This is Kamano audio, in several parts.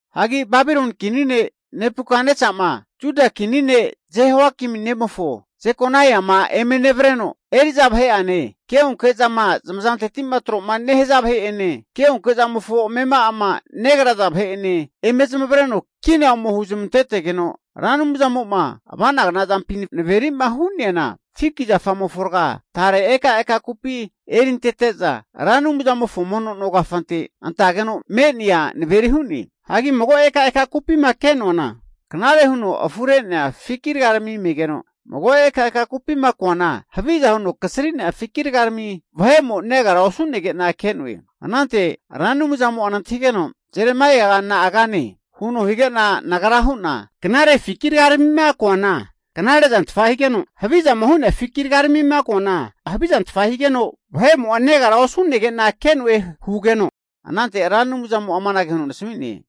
Hagi Babiloni kini ne' Nebukatnesama, Juda kini ne' Jehoiakimi nemofo Jekonaia'ma eme nevreno, eri'za vahe'ane keonke zama zamazanteti'ma tro'ma nehaza vahe'ene ke'onke zamofo amema'ama negraza vahe'ene eme zamavareno kina ome huzmantetegeno, Ra Anumzamo'ma ava'nagna zampi naveri'ma hu'neana, fiki zafamofo raga tare ekaeka kupi erintete'za Ra Anumzamofo mono no kafante antageno me'nea naveri hu'ne. Hagi mago ekaeka kupima ke'noana, knare huno afure'nea fiki rgarami megeno, mago ekaeka kupima koana, haviza huno kasri'nea fiki rgarami vahemo negara osu'negena ke'noe. Anante Ra Anumzamo'a nantahigeno, Jeremaiaga na'a kane? huno hige'na nagra hu'na, knare fiki rgaramima koana, knare zantfa higeno, havizama hu'nea fiki rgaramima koana havizantfa higeno vahe'mo'a negara osu'nege'na ke'noe hugeno, anante Ra Anumzamo'a amanage huno nasami'ne.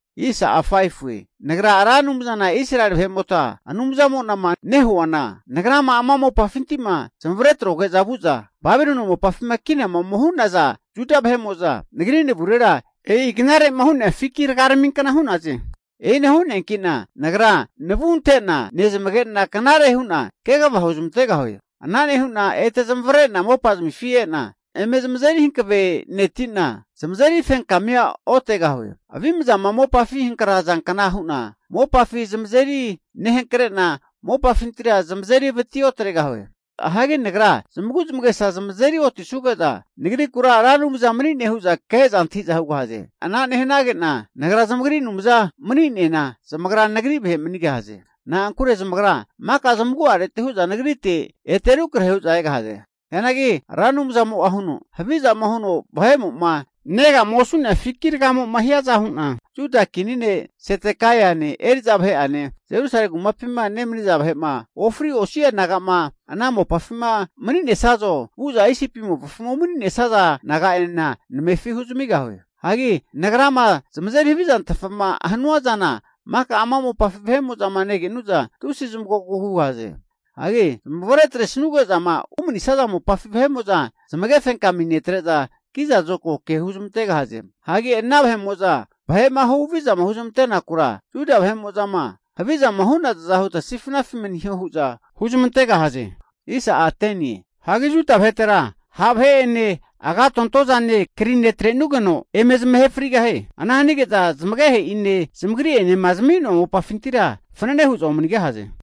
Nagra Ra Anumzana Israeli vahe'mota Anumzamo'nama nehuana, Nagrama ama mopafinti'ma zamavare atroge'za vu'za Babiloni mopafima kinama ome hu'naza Juda vahe'mo'za, nagri navurera e'i knare'ma hu'nea fiki rgaraminkna hu'naze. E'ina hu'neanki'na Nagra navu ante'na nezamage'na knare hu'na kegava huzmantegahue. Ana nehu'na ete zamavare'na mopazamifi e'na, eme zamazeri hankaveneti'na zamazeri fenkamia otegahue. Avimzama mopafi hankrazankna hu'na mopafi zamazeri nehankre'na mopafintira zamazeri vati otregahue. Hagi Nagra zamagu'zamagesa zamazeri otisuge'za Nagrikura Ra Anumza mani'ne hu'za ke'za antahi'za hugahaze. Ana nehanage'na Nagra zamagri Anumza mani'nena, zamagra Nagri vahe manigahaze. Na'ankure zamagra maka zamagu'areti hu'za Nagrite ete rukrahe hu'za egahaze. Hianagi Ra Anumzamo'a huno, Havizama huno vahe'mo'ma negama osu'nea fiki ragamo'ma hiaza hu'na, Juda kini ne' Zedekaiane eri'za vahe'ane, Jerusalemi kumapima nemaniza vahe'ma ofri osi'a naga'ma ana mopafi mani'nesazo, vu'za Isipi mopafima umani'nesaza naga'enena namefi huzamigahue. Hagi Nagrama zamazeri havizantfama hanua zana maka ama mopafi vahe'mo'zama negenu'za, tusi zamagogogu hugahaze. Hagi zamavare atre sanuge'zama umanisaza mopafi vahe'mo'za zamage fenkami netre'za, kiza zokago ke huzamantegahaze. Hagi ana vahe'mo'za vahe'ma huhavizama huzmante'nakura Juda vahe'mo'zama havizama hu'nazaza huta sifnafi maniho hu'za huzmantegahaze. Hagi Juda vahetera ha' vahe'ene agatonto zane krine atrenugeno eme zamahe frigahie. Ana hanige'za zamagehe'ine zamagri'enema zami'noa mopafintira fanane hu'za omanigahaze.